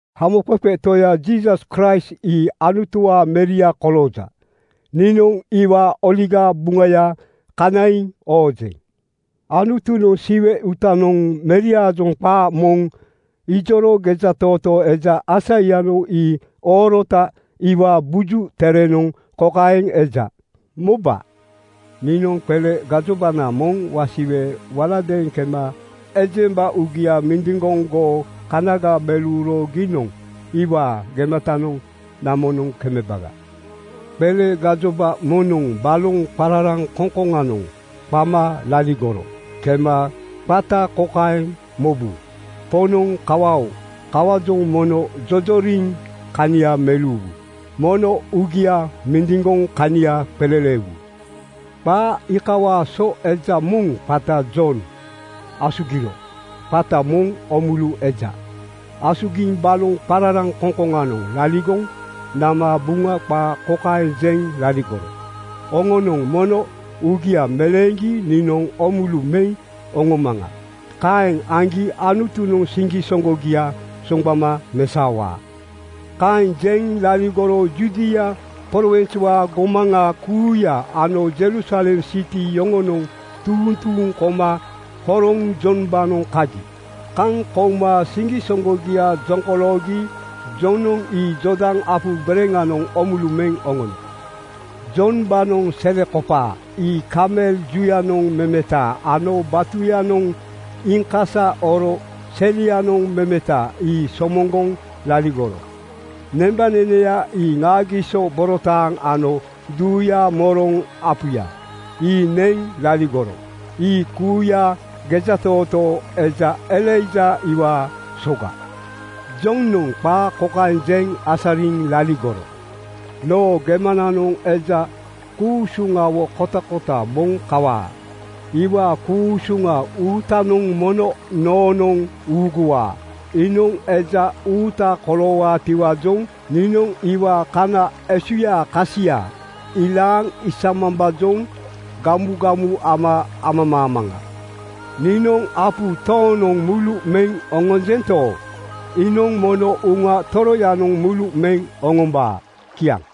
Hamoqeqe Toya Jiisas Kraist ii Anutuwaa Meria kolooja. Niinoŋ iwaa Oligaa Buŋaya kanaiŋ oojeŋ. Anutunoŋ Siwe uutanoŋ meriaajoŋ qaa moŋ ijoro gejatootoo eja Aisaianoŋ ii oorota iwaa Buju Terenoŋ kokaeŋ eja, “Moba. Niinoŋ qele gajobana moŋ wasiwe waladeeŋ kema ejemba uugia mindiŋgoŋ goo kanaga meleuro giinoŋ iwaa gematanoŋ namonoŋ kemeba.” “Qele gajoba moŋnoŋ baloŋ qararaŋkoŋkoŋanoŋ qama laligoro kema qata kokaeŋ mobu, ‘Poŋnoŋ kawa-oo! Kawaajoŋ mono jojoriŋ kania meleuwu. Mono uugia mindiŋgoŋ kania qeleleewu.’” Qaa iikawaa so eja moŋ qata Jon asugiro. qata moŋ Oomulu eja. Asugiŋ baloŋ qararaŋkoŋkoŋanoŋ laligoŋ nama Buŋa qaa kokaeŋ jeŋ laligoro, “Oŋonoŋ mono uugia meleeŋgi niinoŋ oomulu meŋ oŋomaŋa. Kaeŋ aŋgi Anutunoŋ siŋgisoŋgogia soŋgbama mesaowaa.” Kaeŋ jeŋ laligoro Judia prowinswaa gomaŋa kuuya ano Jerusalem siti yoŋonoŋ tuuŋ tuuŋ koma horoŋ Jombaanoŋ kagi. Kaŋ kouma siŋgisoŋgogia jokoloogi Jonoŋ ii Jordan apu bereŋanoŋ oomulu meŋ oŋono. Jombaanoŋ selekopaa ii kamel juyanoŋ memeta ano batuyanoŋ iiŋkasa oro selianoŋ memeta ii somoŋgoŋ laligoro. Nembaneneya ii ŋaagiso borotaaŋ ano duuyaa moroŋ apuya, ii neŋ laligoro. Ii kuuya gejatootoo eja Elaija iwaa soga. Jonoŋ qaa kokaeŋ jeŋ asariŋ laligoro, “Noo gemananoŋ eja ku-usuŋa kotakota moŋ kawaa. Iwaa ku-usuŋa uutanoŋ mono noonoŋ uuguwaa. Iinoŋ eja uuta koloowaatiwaajoŋ niinoŋ iwaa kana esuyaa kasia ilaaŋ isamambaajoŋ gamugamu ama amamaamaŋa. Niinoŋ apu tooŋnoŋ mulu meŋ oŋonjento, iinoŋ mono Uŋa Toroyanoŋ mulu meŋ oŋombaa.” Kiaŋ.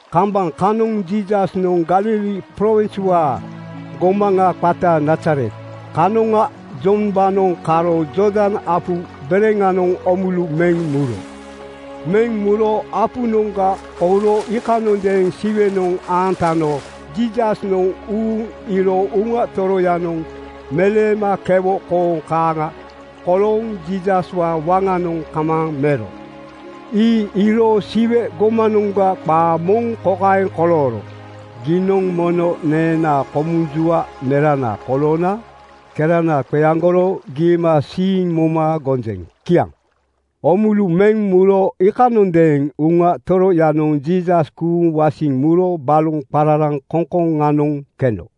Kambaŋ kanoŋ Jiisasnoŋ Galili prowinswaa gomaŋa qata Nazaret kanoŋa Jombaanoŋ karo Jordan apu bereŋanoŋ oomulu meŋ muro. Meŋ muro apunoŋga kouro iikanondeeŋ Siwenoŋ aantano Jiisasnoŋ uuŋ iiro Uŋa Toroyanoŋ meleema kewo kooŋ kaaŋa kolooŋ Jiisaswaa waŋanoŋ kamaaŋ mero. Ii iiro Siwe gomanoŋga qaa moŋ kokaeŋ kolooro, “Giinoŋ mono neenaa komunjua merana koloona kerana qeaŋgoro giimasiiŋ moma gonjeŋ.” Kiaŋ. Oomulu meŋ muro iikanondeeŋ Uŋa Toroyanoŋ Jiisas kuuŋ wasiŋ muro baloŋ qararaŋkoŋkoŋanoŋ keno.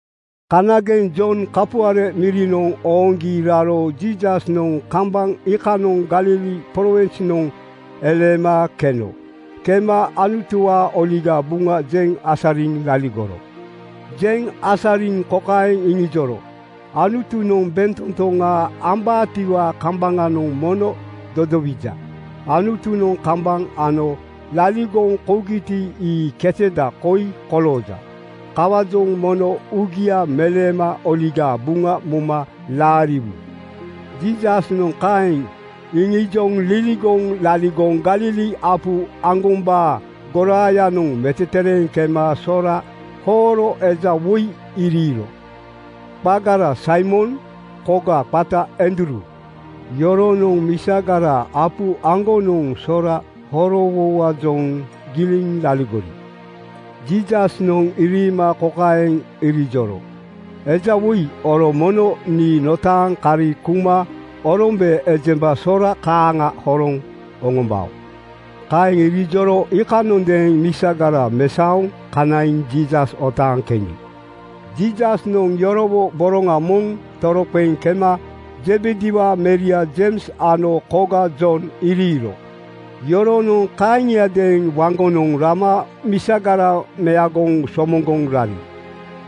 Kanageŋ Jon kapuare mirinoŋ ooŋgi raro Jiisasnoŋ kambaŋ iikanoŋ Galili prowinsnoŋ eleema keno. Kema Anutuwaa Oligaa Buŋa jeŋ asariŋ laligoro. Jeŋ asariŋ kokaeŋ iŋijoro, “Anutunoŋ bentotoŋa ambaatiwaa kambaŋanoŋ mono dodowija. Anutunoŋ kambaŋ ano laligoŋ kougiti, ii keteda koi kolooja. Kawaajoŋ mono uugia meleema Oligaa Buŋa moma laariwu.” Jiisasnoŋ kaeŋ iŋijoŋ liligoŋ laligoŋ Galili apu aŋgombaa goraayanoŋ metetereeŋ kema sora hooro eja woi iriiro. Qagara Saimon, koga qata Andruu. Yoronoŋ misagara apu aŋgonoŋ sora horowowaajoŋ giliŋ laligori. Jiisasnoŋ iriima kokaeŋ irijoro, “Ejawoi, oro mono nii notaaŋ kari kuma orombe ejemba sora kaaŋa horoŋ oŋombao.” Kaeŋ irijoro iikanondeeŋ misagara mesaoŋ kanaiŋ Jiisas otaaŋ keni. Jiisasnoŋ yorowo boroŋa moŋ toroqeŋ kema Zebediwaa meria Jeims ano koga Jon iriiro. Yoronoŋ kaaŋiadeeŋ waŋgonoŋ rama misagara meagoŋ somoŋgoŋ rari.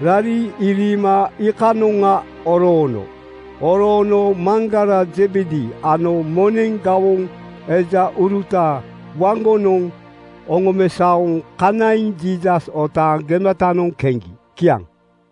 Rari iriima iikanoŋa oroono. Oroono maŋgara Zebedi ano moneŋ gawoŋ ejauruta waŋgonoŋ oŋomesaoŋ kanaiŋ Jiisas otaaŋ gematanoŋ keni. Kiaŋ.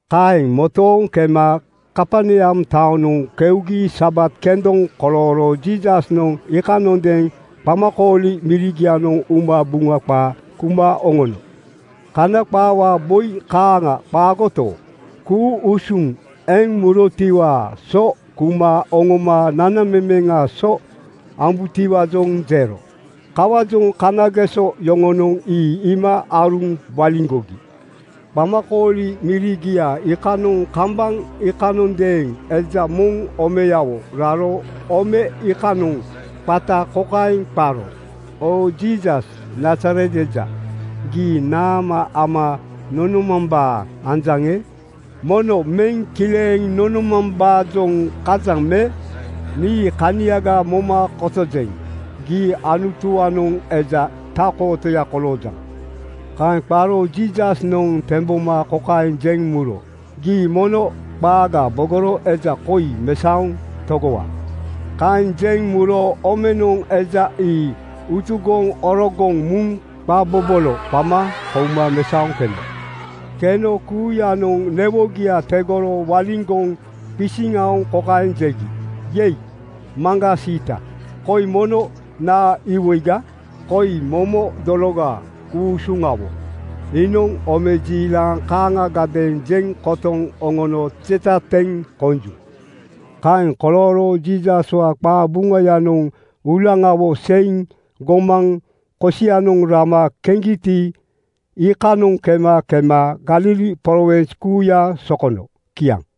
Kaeŋ motooŋ kema Kaperneam taonoŋ keugi Sabat kendoŋ kolooro Jiisasnoŋ iikanondeeŋ qamakooli mirigianoŋ uma Buŋa qaa kuma oŋono. Kana qaawaa boi kaaŋa qaagoto, ku-usuŋ eŋ murotiwaa so kuma oŋoma nanamemeŋaa so ambutiwaajoŋ jero. Kawaajoŋ kanageso yoŋonoŋ ii iima aaruŋ waliŋgogi. Qamakooli mirigia iikanoŋ kambaŋ iikanondeeŋ eja moŋ omeyawo raro ome iikanoŋ qata kokaeŋ qaro, “Oo Jiisas, Nazaret eja! Gii naama ama nonomambaa anjaŋe? Mono meŋ kileeŋ nonomambaajoŋ kajaŋ me? Nii kaniaga moma kotojeŋ. Gii Anutuwaanoŋ eja Tak-kootoya koloojaŋ.” Kaeŋ qaro Jiisasnoŋ temboma kokaeŋ jeŋ muro, “Gii mono qaaga bogoro eja koi mesaoŋ togowa.” Kaeŋ jeŋ muro omenoŋ eja ii utugoŋ orogoŋ muŋ qa bobolo qama kouma mesaoŋ keno. Keno kuuyanoŋ newogia tegoro waliŋgoŋ qisiŋ aoŋ kokaeŋ jegi, “Yei, maŋgaa siita! Koi mono naa iwoiga? Koi momo dologa ku-usuŋawo. Iinoŋ omejiilaŋ kaaŋagadeeŋ jeŋ kotoŋ oŋono jeta teŋ konju.” Kaeŋ kolooro Jiisaswaa qabuŋayanoŋ uulaŋawo seiŋ gomaŋ kosianoŋ rama keŋgiti, iikanoŋ kema kema Galili prowins kuuya sokono. Kiaŋ.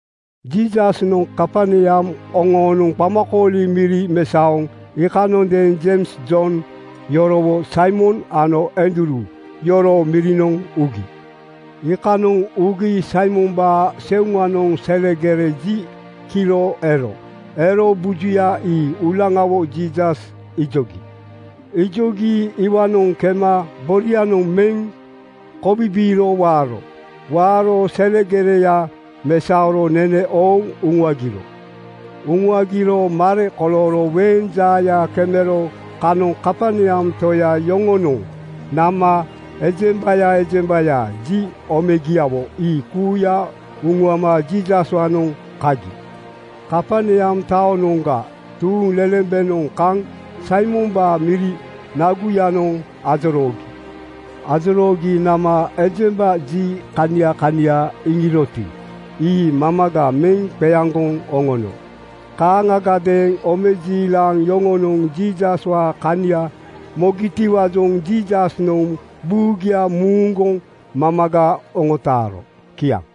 Jiisasnoŋ Kaperneam oŋoonoŋ qamakooli miri mesaoŋ iikanondeeŋ Jeims Jon yorowo Saimon ano Andruu yoroo mirinoŋ ugi. Iikanoŋ ugi Saimombaa seuŋanoŋ selegere ji kiro ero. Ero bujuya ii uulaŋawo Jiisas ijogi. Ijogi iwaanoŋ kema borianoŋ meŋ kobibiiro waaro. Waaro selegereya mesaoro nene ooŋ uŋuagiro. Uŋuagiro mare kolooro weeŋ jaaya kemero kanoŋ Kaperneam toya yoŋonoŋ nama ejembaya ejembaya ji omegiawo ii kuuya uŋuama Jiisaswaanoŋ kagi. Kaperneam taonoŋga tuuŋlelembenoŋ kaŋ Saimombaa miri naguyanoŋ ajoroogi. Ajoroogi nama ejemba ji kania kania iŋiroti, ii mamaga meŋ qeaŋgoŋ oŋono. Kaaŋagadeeŋ omejiilaŋ yoŋonoŋ Jiisaswaa kania mogitiwaajoŋ Jiisasnoŋ buugia muuŋguŋ mamaga oŋotaaro. Kiaŋ.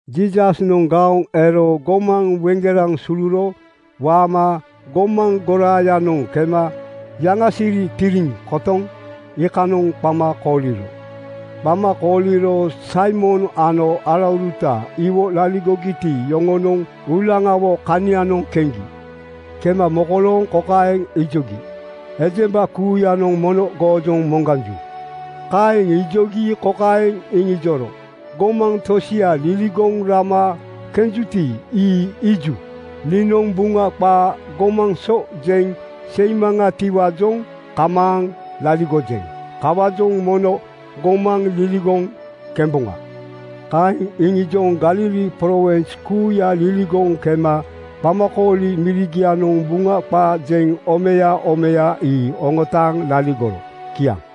Jiisasnoŋ gaoŋ ero gomaŋ weŋgeraŋ suluro waama gomaŋ goraayanoŋ kema yaŋasiri tiriŋ kotoŋ iikanoŋ qama kooliro. Qama kooliro Saimon ano alauruta iwo laligogiti, yoŋonoŋ uulaŋawo kanianoŋ keŋgi. Kema mokolooŋ kokaeŋ ijogi, “Ejemba kuuyanoŋ mono goojoŋ moŋganju.” Kaeŋ ijogi kokaeŋ iŋijoro, “Gomaŋ tosia liligoŋ rama kenjuti, ii iiju. Niinoŋ Buŋa qaa gomaŋ so jeŋ seimaŋatiwaajoŋ kamaaŋ laligojeŋ. Kawaajoŋ mono gomaŋ liligoŋ kemboŋa.” Kaeŋ iŋijoŋ Galili prowins kuuya liligoŋ kema qamakooli mirigianoŋ Buŋa qaa jeŋ omeya omeya ii oŋotaaŋ laligoro. Kiaŋ.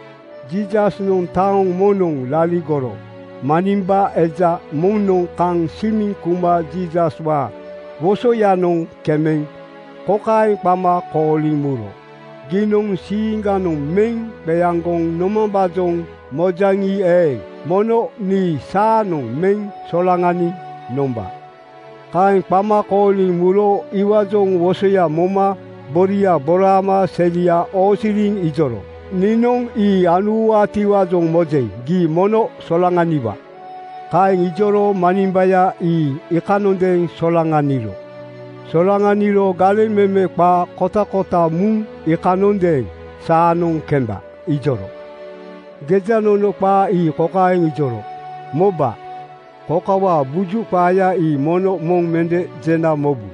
Jiisasnoŋ taoŋ moŋnoŋ laligoro manimba eja moŋnoŋ kaŋ simiŋ kuma Jiisaswaa wosoyanoŋ kemeŋ kokaeŋ qama kooliŋ muro, “Giinoŋ siiŋganoŋ meŋ qeaŋgoŋ nomambaajoŋ mojaŋi eeŋ, mono nii saanoŋ meŋ solaŋaniŋ nomba.” Kaeŋ qama kooliŋ muro iwaajoŋ wosoya moma boria boraama selia oosiriŋ ijoro, “Niinoŋ ii anuwaatiwaajoŋ mojeŋ. Gii mono solaŋaniwa.” Kaeŋ ijoro manimbaya ii iikanondeeŋ solaŋaniro. Solaŋaniro galeŋ meme qaa kotakota muŋ iikanondeeŋ “Saanoŋ kemba,” ijoro. Gejanono qaa ii kokaeŋ ijoro, “Moba. Kokawaa buju qaaya ii mono moŋ mende jena mobu.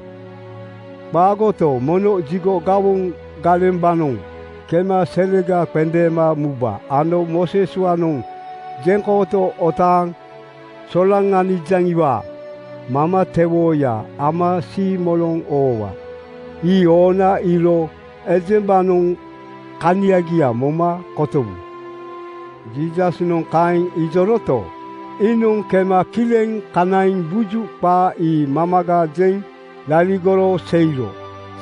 Qaagoto, mono jigo gawoŋ galembaanoŋ kema selega qendeema muba ano Mooseswaanoŋ jeŋkooto otaaŋ solaŋanijaŋiwaa mamatewooya ama siimoloŋ oowa. Ii oona iiro ejembanoŋ kaniaga moma kotowu.” Jiisasnoŋ kaeŋ ijoroto, iinoŋ kema kileŋ kanaiŋ buju qaa ii mamaga jeŋ laligoro seiro.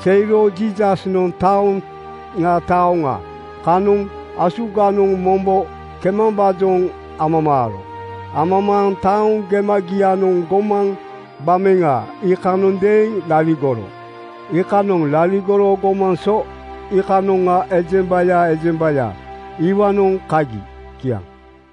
Seiro Jiisasnoŋ taoŋa taoŋa kanoŋ asuganoŋ mombo kemambaajoŋ amamaaro. Amamaaŋ taoŋ gemagianoŋ gomaŋ gbameŋa iikanondeeŋ laligoro. Iikanoŋ laligoro gomaŋ so iikanoŋa ejembaya ejembaya iwaanoŋ kagi. Kiaŋ.